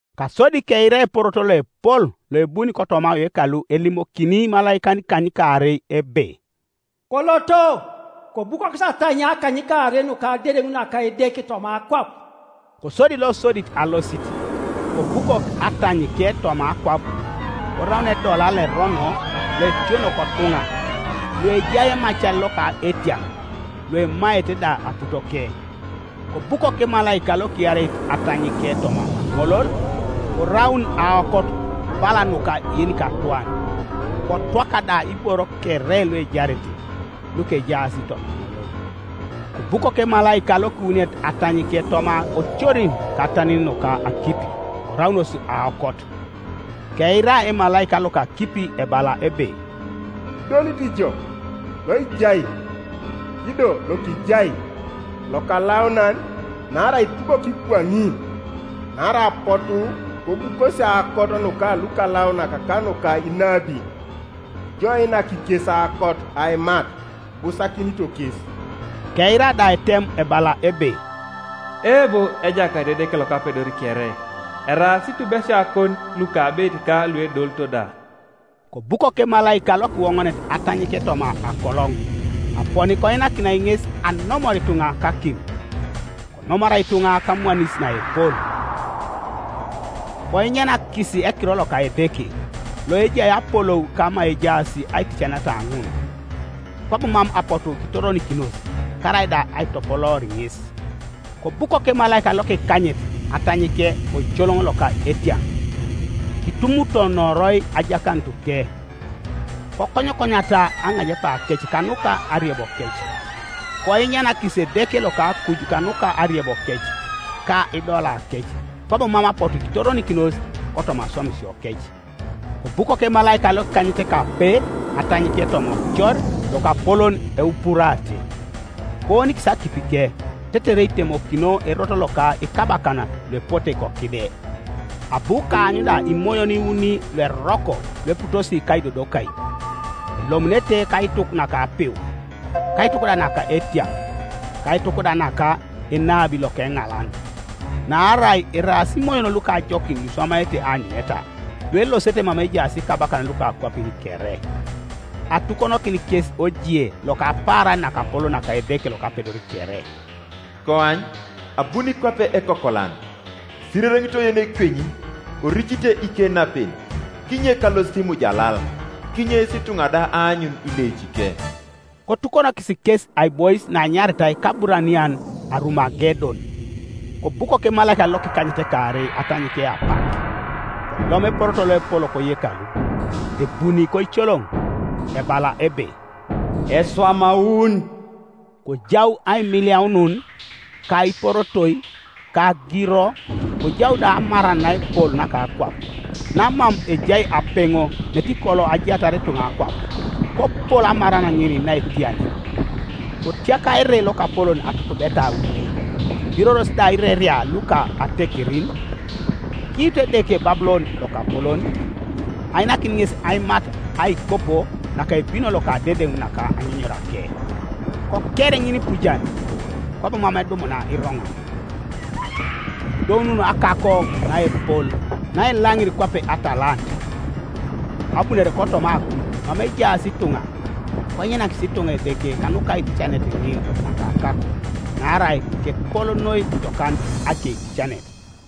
Kasodi keira eporoto loepol loebuni kotoma oyekalu elimokini imalaikan ikanykaarei ebe, “Koloto, kobukokis atanyia akanykaarei nuka adedeŋ naka Edeke toma akwap.” Kosodi losodit alosit, kobukok atanyike toma akwap, koraun edola loerono loetiono kotuŋa luejai emacar loka etiaŋ, luemaete da aputoke. Kobukok emalaika lokiareit atanyike toma aŋolol, koraun aokot bala nuka yenikatwan, kotwaka da iboro kere luejarete, lukejaas toma aŋolol. Kobukok emalaika lokiwuniet atanyike toma ocorin ka atanin nuka akipi, koraunos aokot. Keira emalaika loka akipi ebala ebe, “Idolit ijo, loijai, ido lokijai, Lokalaunan, Naarai itubok kwaŋin. Naarai apotu kobukosi aokot nuka lukalaunak ka nuka inabin, Ijo iinak kes aokot aimat, Ibusakinito kes!” Keira da etem ebala ebe: “Eebo, Ejakait Edeke Lokapedor kere, Eraas itubesiakon lukabeit ka luedolito da.” Kobukok emalaika lokiwoŋonet atanyike toma akoloŋ, aponi koinakinai ŋes anomor ituŋa kakim. Konomoroi ituŋa kamwanis naepol, koinyanakis ekiror loka Edeke, loejai apolou kama ejaas aiticaneta ŋun, kwabo mam apotu kitoronikinos, karaida aitopoloor ŋes. Kobukok emalaika lokikanyet atanyike oicoloŋ loka etiaŋ, kitumutonoroi ajakanutuke; kokonyokonyata aŋajepakec kanuka ariebokec. Koinyanakis Edeke loka akuj kanuka ariebokec, ka idolakec, kwabo mam apotu kitoronikinos kotoma aswamisiokec. Kobukok emalaika lokikanyetekape atanyike toma ocor lokapolon Eupurate, koonikis akipike, tetere itemokino erot loka ikabakan luepote kokide. Abu kaany da imoyon iuni lueroko lueputosi kaidodokai, elomunete kaituk naka apiu, kaituk da naka etiaŋ, kaituk da naka enabi lokeŋalan. Naarai eraas imoyon luka ajokin luiswamaete aanyuneta, luelosete mama ejaas ikabakan luka akwapin kere, atukonokin kes ojie loka apaaran nakapolon naka Edeke Lokapedor kere, (“Koany, abuni kwape ekokolan! Isirereŋitoi yenekwenyi, koricite ikenapen, kinyek alosit imujalal, kinyeis ituŋa da aanyun ileicike!”) Kotukonokis kes aibois naenyaritai kAburanian Arumagedon. Kobukok emalaika lokikanyetekaarei atanyike apak, kolom eporoto loepol koyekalu, ebuni koicoloŋ, ebala ebe, “Eswamaun!” Kojau aimiliaunun, ka iporotoi, ka agiro, kojau da amaran naepol naka akwap, namam ejai apeŋo netikolo ajaatar ituŋa akwap, kopol amaran ŋin naetia nen. Kotiaka ere lokapolon atutubeta auni, kibiroros da ireria luka atekerin, Kiitu Edeke Babulon lokapolon, ainakin ŋes aimat aikopo naka ebino loka adedeŋ naka anyunyurake. Koker ŋinipujan, kwabo mam edumuna iroŋan; kodounun akako naepol, naelaŋir kwape atalant, abunore kotoma akuj mama ejaas ituŋa, koinyanakis ituŋa Edeke kanuka aiticanet ŋin naka akako, naarai kepol noi jokan akeitieanet.